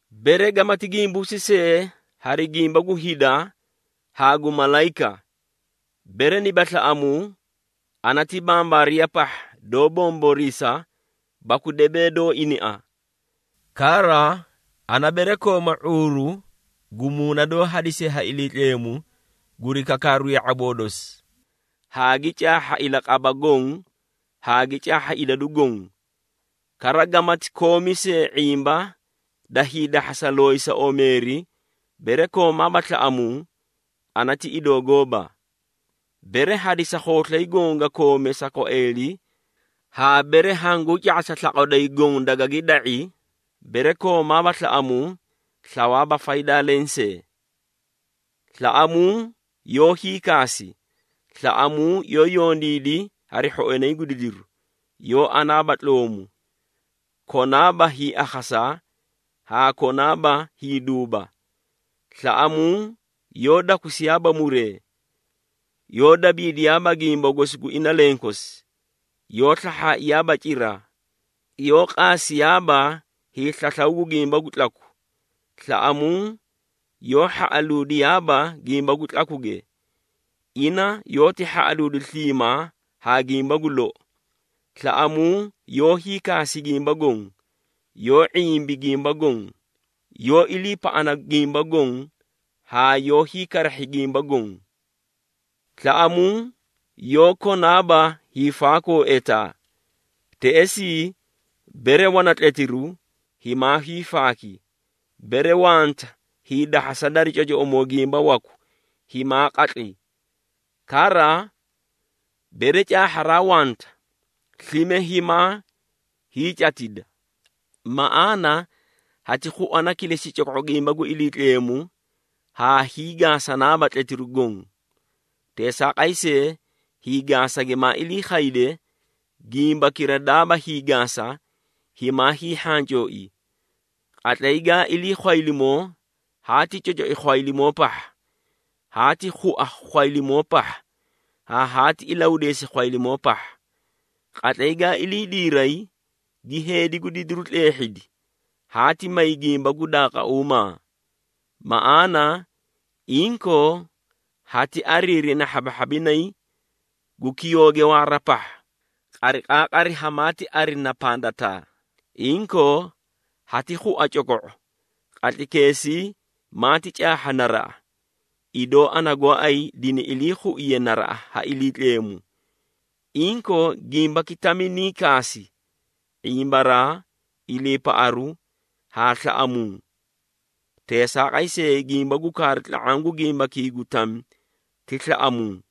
Bere gamati gimbuusi see hari gimba gu hida haa gu malayika, bere niba slaꞌamuu, ana ti bambaariya pahha, doó bomboriisa baku debee doó inia. Kara, ana bere kooma ⁄uuru gu muuna doó hadisiye ha Iliitleemu guri kakaaru ya⁄aboo dosi, haa gi caahha ilaqaba goõ haa gi caahha idadu goõ, kara gamati koomi see ⁄imba da hiidahhasa looyisa omeeri, bere koomaaba slaꞌamuu, ana ti idoo gooba. Bere hadisa khooslay goõ ga koome sa kwaeeli haa bere hanguu ca⁄asa slaqwa doyi goõ dagagi da⁄i, bere koomaaba slaꞌamuu, slawaaba faydaa lensee. Slaꞌamuu yoó hiikaasi, slaꞌamuu yoó yondiidi hari hhoinay gu didiru, yoó anaaba tloomu, konaaba hiiakhasa haa konaaba hiiduuba. Slaꞌamuu yoó dakusiyaaba muree, yoó dabiidiyaaba gimba gosi gu ina lenkosi, yoó slahhaaiyaaba cira, yoó qaasiyaaba hiislaslaw gu gimba gu tlaku. Slaꞌamuu yoó hhaꞌaluudiyaaba gimba gu tlakuge, ina yoóti hhaꞌaluudi sliimaa haa gimba gu lou. Slaꞌamuu yoó hiikaasi gimba goõ, yoó ⁄imbi gimba goõ, yoó iliipaꞌana gimba goõ haa yoó hiikarahhi gimba goõ. Slaꞌamuu yoó konaaba hiifaakoo etaa. Teꞌesii bere wana tletiru, himaa hiifaaki, bere wanta hiidahhasa dari cocoꞌomoo gimba waku, himaa qatli. Kara, bere caahharaa wanta, slime himaa hiicatida. Maꞌaana hati khuana kilesi coko⁄u gimba gu Iliitleemu haa hiigaasanaaba tletiru goõ. Teesaaqay see, hiigaasa gimaa ilii khayde, gimbakira daaba hiigaasa, himaa hiihhancooi. Qatlay gaa ilii khwaylimoo, haati cocoi khwaylimoo pahha, haati khua khwaylimoo pahha haa haati ilahudeesi khwaylimoo pahha. Qatlay gaa ilii diiray, gi heedi gu didiru tleehhidi, haati may gimba gu daaqauumaa. Maꞌaana, inkoo hati ariirina hhabahhabinay gu kiyooge waara pahha, qariqaaqari hamaati arina pandataa. Inkoo, hati khua coko⁄o, qatlaykeesii maati caahha naraꞌa, idoo ana gooay dini ilii khuiye naraꞌa ha Iliitleemu. Inkoo, gimbaki tami nii kaasi: ⁄imbaraa, iliipaꞌaru haa slaꞌamuu. Teesaaqay see, gimba gu kaaru tla⁄aã gu gimbakii gu tami ti slaꞌamuu.